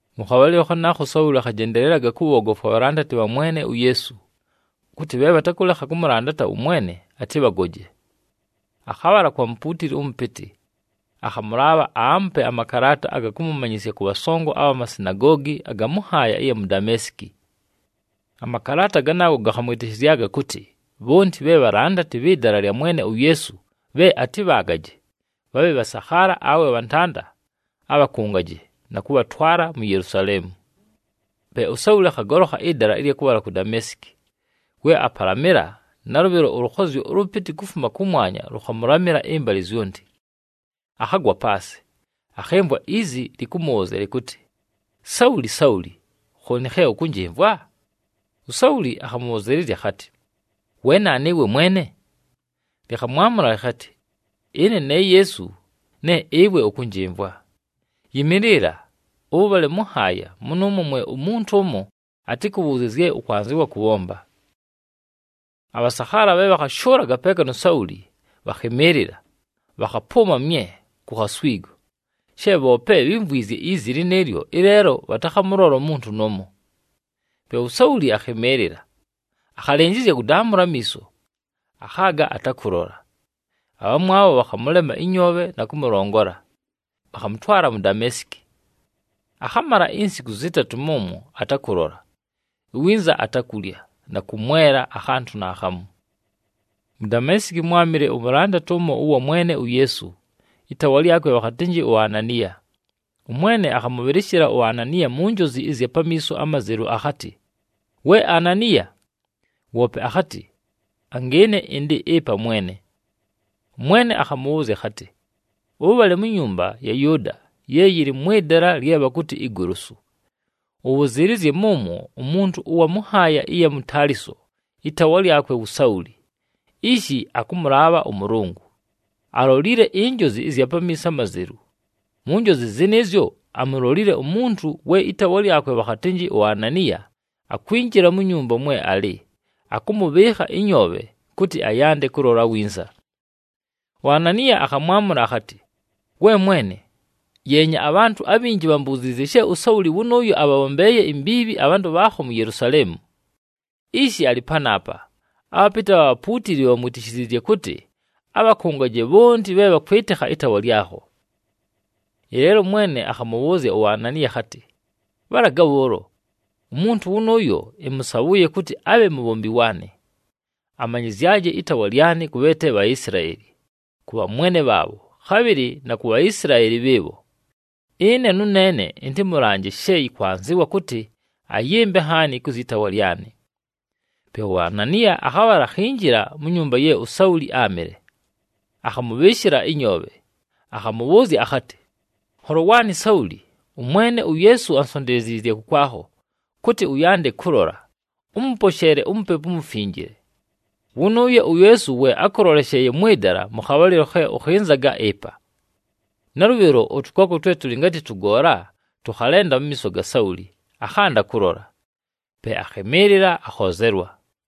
Mʉ khabhalɨlo khanaakho, uSauli akhajendelelaga kʉbhoogofwa abhalandati bha Mwene uYeesu, kʉtɨ bhe bhatakʉlekha kʉmʉlandata ʉMwene, atɨbhagoje. Akhabhala kwa mupuutili ʉmʉpɨtɨ, akhamʉlaabha aamupe amakalaata aga kʉmʉmanyɨsya kʉ bhasongo abha masinagoogi aga mʉ nhaaya ɨya mu Dameesiki. Amakalaata ganaago gakhamwɨtɨshɨzyaga kʉtɨ bhonti bhe bhalandati bhɨ Dala lya Mwene uYeesu bhe atɨbhaagaje, bhabhe bhasakhaala awe bhantanda, abhakʉngaje, na kʉbhatwala mu Yelusaleemu. Pe uSauli akhagolokha ɨdala ɨlya kʉbhala ku Dameesiki. We apalamɨla, nalʉbhɨlo ʉlʉkhozyo ʉlʉpɨtɨ kufuma kʉmwanya lʉkhamʉlamɨla ɨmbalɨ zyonti. Akhagwa paasɨ, akhɨmvwa izi lɨkʉmʉbhʉʉzya lɨkʉtɨ, “Sauli! Sauli! Khooni khe ʉkʉnjɨmvwa?” USauli akhabhʉzɨɨlɨzya akhatɨ, “We naanu ɨwe Mwene?” Lɨkhamwamʉla lɨkhatɨ, “Ɨne ne Yeesu ne ɨwe ʉkʉnjɨmvwa. Yɨmɨɨlɨla! Ʉbhale mʉ nhaaya, mʉnʉʉmwo mwe umuntu ʉmo atɨkʉbhʉʉzye zye ʉkwanzɨwa kʉbhomba.” Abhasakhaala bhe bhakhashʉʉlaga peeka nu Sauli bhakhɨmɨɨlɨla, bhakhapʉʉma mye ku khaswigo, she bhoope bhímvwizye izi lɨnɨɨlyo, ɨleelo bhatakhamʉlola umuntu nʉʉmo. Pe uSauli akhɨmɨɨlɨla, akhalɨnjɨzya kʉdaamʉla amiiso, akhaaga atakʉlola. Abhamwabho bhakhamʉlema ɨnyoobhe na kʉmʉlongola, bhakhamʉtwala mu Dameesiki. Akhamala insiku zɨtatʉ mʉmwo atakʉlola, iwinza atakulya, na kʉmwela akhantʉ naakhamu. Mu Dameesiki, mwámɨle umulandati ʉmo ʉwa Mwene uYeesu, ɨtaawa lyakwe bhakhatɨnjɨ uAnaniya. ɄMwene akhamʉbhɨlɨshɨla uAnaniya mu njozi ɨzya pamiiso amazelu akhatɨ, “We Ananiya!” Woope akhatɨ, “Angɨɨne ɨndɨ ɨpa Mwene.” ɄMwene akhamʉbhʉʉzya akhatɨ, “Ʉbhale mu nyumba ya Yʉʉda ye yɨlɨ mwɨ dala lye bhakʉtɨ Igolosu, ʉbhʉzɨɨlɨzye mʉmwo umuntu ʉwa mʉ nhaaya ɨya mu Taliso, ɨtaawa lyakwe wu Sauli. Ishi akʉmʉlaabha ʉMʉlʉngʉ, alolile injozi ɨzya pamiiso amazelu. Mu njozi zɨnɨɨzyo, amulolile umuntu we ɨtaawa lyakwe bhakhatɨnjɨ uAnaniya akwinjila mu nyumba mwe alɨ, akʉmʉbhɨɨkha ɨnyoobhe, kʉtɨ ayande kʉlola winza.” UAnaniya akhamwamʉla akhatɨ, “We Mwene, yeenya abhantʉ abhinji bhambuziizye she uSauli wʉnʉʉyo abhabhombeeye imbiibhi abhantʉ bhaakho mu Yelusaleemu! Ishi alɨ panaapa, abhapɨtɨ abha bhapuutili bhamwitishiziizye kʉtɨ abhakʉngaje bhonti bhe bhakwɨtɨkha ɨtaawa lyakho.” Ɨleelo ʉMwene akhamʉbhʉʉzya uAnaniya akhatɨ, “Bhalaga bhʉʉlo! Umuntu wʉnʉʉyo, ɨmʉsabhʉʉye kʉtɨ abhe mubhombi waanɨ, amanyɨzyaje ɨtaawa lyanɨ kʉ bhe te Bhaisilaeli, kʉ bhamwene bhaabho, khabhɨlɨ na ku Bhaisilaeli bhɨɨbho. Ɨne nʉneene ɨntɨmʉlanje she yɨkwanzɨwa kʉtɨ ayɨmbe nhaani kʉ zyɨ taawa lyanɨ.” Pe uAnaniya akhabhala akhinjila mu nyumba ye uSauli áamɨle. Akhamʉbhɨɨshɨla ɨnyoobhe, akhamʉbhʉʉzya akhatɨ, “Nholo waanɨ Sauli, ʉMwene uYeesu ansonteleziizye kʉkwakho, kʉtɨ ʉyande kʉlola, ʉmʉposheele uMupepu uMufinjile. Wʉnʉʉyo uYeesu we ákʉlolesheeye mwɨ dala mʉ khabhalɨlo khe ʉkhɨnzaga ɨpa.” Nalʉbhɨlo ʉtʉkooko twe tʉlɨ ngatɨ tʉgoola tʉkhalenda mu miiso ga Sauli, akhanda kʉlola. Pe akhɨmɨɨlɨla, akhoozelwa.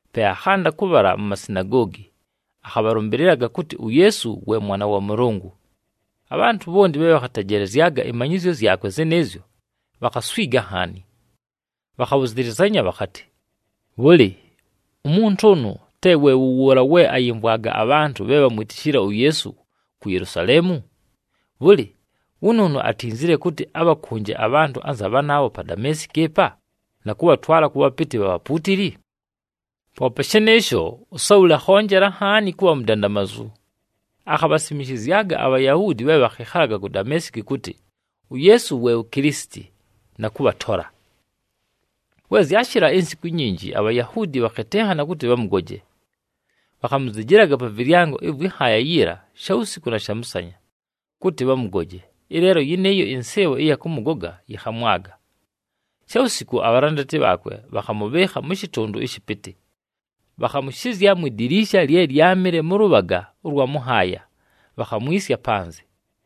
Pe akhanda kʉbhala mu masinagoogi, akhabhalʉmbɨlɨlaga kʉtɨ uYeesu we Mwana wa Mʉlʉngʉ. Abhantʉ bhonti bhe bhakhatejelezyaga ɨmanyɨzyo zyakwe zɨnɨɨzyo, bhakhaswiga nhaani. Bhakhabhʉzɨlɨzanya bhakhatɨ, “Bhʉlɨ, umuntu ʉnʉ, te we wʉ wʉʉla we ayɨmvwaga abhantʉ bhe bhamwitishile uYeesu ku Yelusaleemu? Bhʉlɨ, wʉnʉʉnʉ atinzile kʉtɨ abhakʉnje abhantʉ anza bhanaabho pa Dameesiki ɨpa na kʉbhatwala kʉ bhapɨtɨ bha bhapuutili?” Poope shɨnɨɨsho, uSauli akhonjela nhaani kʉbha mudandamazu, akhabhasimishizyaga aBhayahuudi bhe bhakhɨkhalaga ku Dameesiki kʉtɨ uYeesu we wu Kilisiti, na kʉbhatola. We zyashɨla insiku inyinji, aBhayahuudi bhakhɨtɨnhana kʉtɨ bhamʉgoje. Bhakhamuzijilaga pa vɨlyango ɨvwɨ nhaaya yiila shawusiku na shamʉsanya, kʉtɨ bhamʉgoje. Ɨleelo yɨnɨɨyo ɨnsɨɨbho ɨya kʉmʉgoga, yɨkhamwaga. Shawusiku abhalandati bhaakwe bhakhamʉbhɨɨkha mʉ shɨtʉndʉ ɨshɨpɨtɨ, bhakhamʉshɨzya mwi diliisha lye lyámɨle mʉ lʉbhaga ʉlwa mʉ nhaaya, bhakhamwisya panzɨ.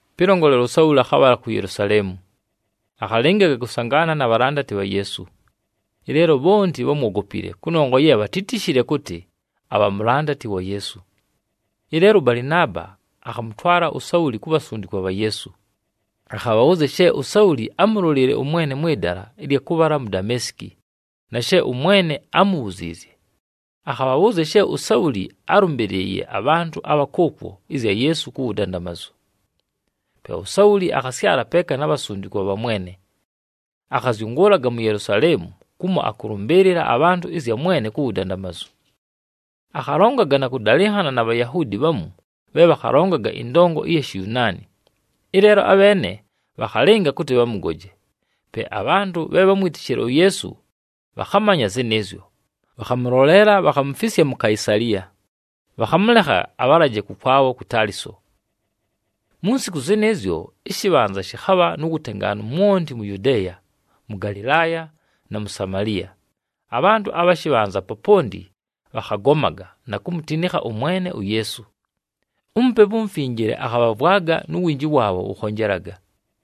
Pɨlongolela, uSauli akhabhala ku Yelusaleemu, akhalɨngaga kʉsangaana na bhalandati bha Yeesu. Ɨleelo bhonti bhámwogopile, kʉnongwa ye bhatítishile kʉtɨ abha mulandati wa Yeesu. Ɨleelo ʉBalɨnaaba akhamʉtwala uSauli ku bhasundikwa bha Yeesu. Akhabhabhʉʉzya she uSauli ámulolile ʉMwene mwɨ dala ɨlya kʉbhala mu Dameesiki, na she ʉMwene ámubhuziizye. Akhabhabhʉʉzya she uSauli álʉmbɨlɨɨye abhantʉ abha kʉʉkwo ɨzya Yeesu ku wudandamazu. Pe uSauli akhasyala peeka na bhasundikwa bha Mwene. Akhazyʉngʉʉlaga mu Yelusaleemu, kumo akʉlʉmbɨɨlɨla abhantʉ ɨzya Mwene ku wudandamazu. Akhalongaga na kʉdalɨnhana na Bhayahuudi bhamu bhe bhakhalongaga ɨndongo ɨya Shiyunaani, ɨleelo abheene bhakhalɨnga kʉtɨ bhamʉgoje. Pe abhantʉ bhe bhámwitishile uYeesu bhakhamanya zɨnɨɨzyo, bhakhamʉloleela, bhakhamufisya mu Kaisaliya, bhakhamʉlekha abhalaje kʉkwabho ku Taliso. Mu nsiku zɨnɨɨzyo, ɨshɨbhanza shɨkhabha nu wutengaanu mwonti mu Yudeeya, mʉ Galɨlaaya, na mu Samaliya. Abhantʉ abha shɨbhanza poponti bhakhagomaga, na kumutinikha ʉMwene uYeesu. UMupepu uMufinjile akhabhavwaga, nu winji waabho wʉkhonjelaga.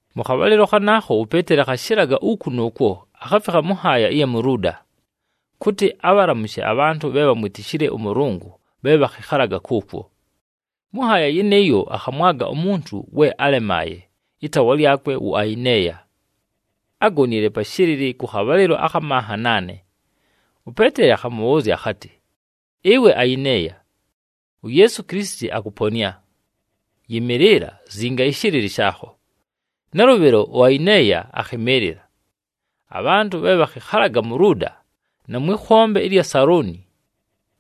Mʉ khabhalɨlo khanaakho uPeeteli akhashɨlaga uku nʉʉkwo, akhafikha mʉ nhaaya ɨya mu Luuda, kʉtɨ abhalamushe abhantʉ bhe bhamwitishile ʉMʉlʉngʉ bhe bhakhɨkhalaga kʉʉkwo. Mʉ nhaaya yɨnɨɨyo, akhamwaga umuntu we álemaaye, ɨtaawa lyakwe wu Ayineeya. Ágonile pa shɨlɨlɨ kʉ khabhalɨlo akha manha naane. UPeeteli akhamʉbhʉʉzya akhatɨ, “Ɨwe Ayineeya, uYeesu Kilisiti akʉponɨa. Yɨmɨɨlɨla! Zinga ɨshɨlɨlɨ shaakho.” Nalʉbhɨlo uAyineeya akhɨmɨɨlɨla. Abhantʉ bhe bhakhɨkhalaga mu Luuda, na mwɨ khombe ɨlya Saloni,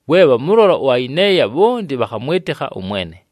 we bhamʉlola uAyineeya, bhonti bhakhamwɨtɨkha ʉMwene.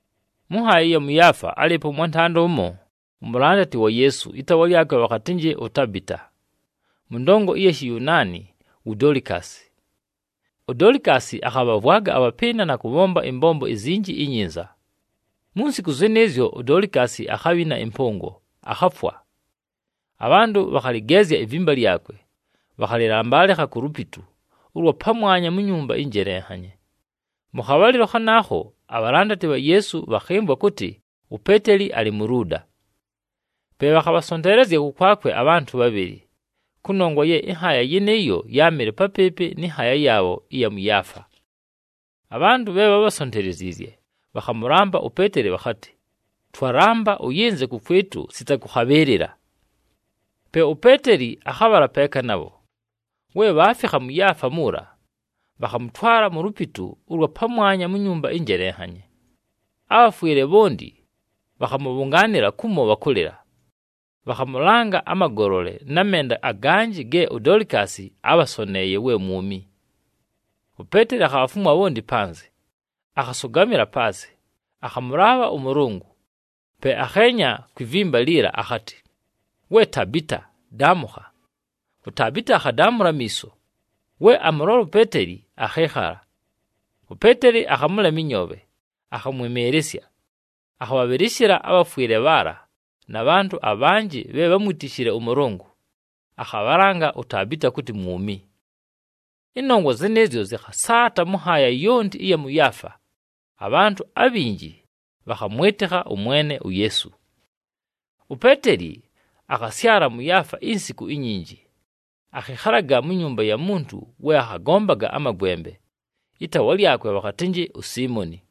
Mʉ nhaaya ɨya mʉ Yaafa álɨɨpo ʉmwantanda ʉmo, umulandati wa Yeesu, ɨtaawa lyakwe bhakhatɨnjɨ uTabita. Mʉ ndongo ɨya Shiyunaani, wu Dolikasi. UDolikasi akhabhavwaga abhapɨɨna na kʉbhomba ɨmbombo izinji inyinza. Mu nsiku zɨnɨɨzyo, uDolikasi akhabhina ɨmpʉngo, akhafwa. Abhantʉ bhakhalɨgeezya ivimba lyakwe, bhakhalɨlambalɨkha ku lupitu ʉlwa pamwanya mu nyumba ɨnjelenhanye. Mʉ khabhalɨlo khanaakho abhalandati bha Yeesu bhakhɨmvwa kʉtɨ uPeeteli alɨ mu Luuda. Pe bhakhabhasonteelezya kʉkwakwe abhantʉ bhabhɨlɨ, kʉnongwa ye ɨnhaaya yɨnɨɨyo yáamɨle papɨɨpɨ nɨ nhaaya yaabho ɨya mʉ Yaafa. Abhantʉ bhe bhábhasonteleziizye bhakhamʉlamba uPeeteli bhakhatɨ, “Twalamba ʉyɨnze kʉkwɨtʉ sita kʉkhabhɨɨlɨla!” Pe uPeeteli akhabhala peeka nabho. We bhaafikha mʉ Yaafa muula, bhakhamʉtwala mu lupitu ʉlwa pamwanya mu nyumba ɨnjelenhanye. Abhafwɨle bhonti bhakhamʉbhʉngaanɨla kumo bhakʉlɨla. Bhakhamʉlanga amagolole, na menda aganjɨ ge uDolikasi ábhasoneeye we mwumi. UPeeteli akhabhafumwa bhonti panzɨ, akhasʉgamɨla paasɨ, akhamʉlaabha ʉMʉlʉngʉ. Pe akheenya kwi vimba liila akhatɨ, “We Tabita, daamʉkha!” UTabita akhadaamʉla amiiso. We amʉlola uPeeteli, akhɨɨkhala. UPeeteli akhamʉlema ɨnyoobhe, akhamwɨmɨɨlɨsya. Akhabhabhɨlɨshɨla abhafwɨle bhaala, na bhantʉ abhanjɨ bhe bhámwitishile ʉMʉlʉngʉ, akhabhalanga uTabita kʉtɨ mwumi. Ɨnongwa zɨnɨɨzyo zɨkhasaata mʉ nhaaya yonti ɨya mʉ Yaafa, abhantʉ abhinji bhakhamwɨtɨkha ʉMwene uYeesu. UPeeteli akhasyala mʉ Yaafa insiku inyinji, akhɨkhalaga mu nyumba ya muntu we akhagombaga amagwembe, ɨtaawa lyakwe bhakhatɨnjɨ uSiimoni.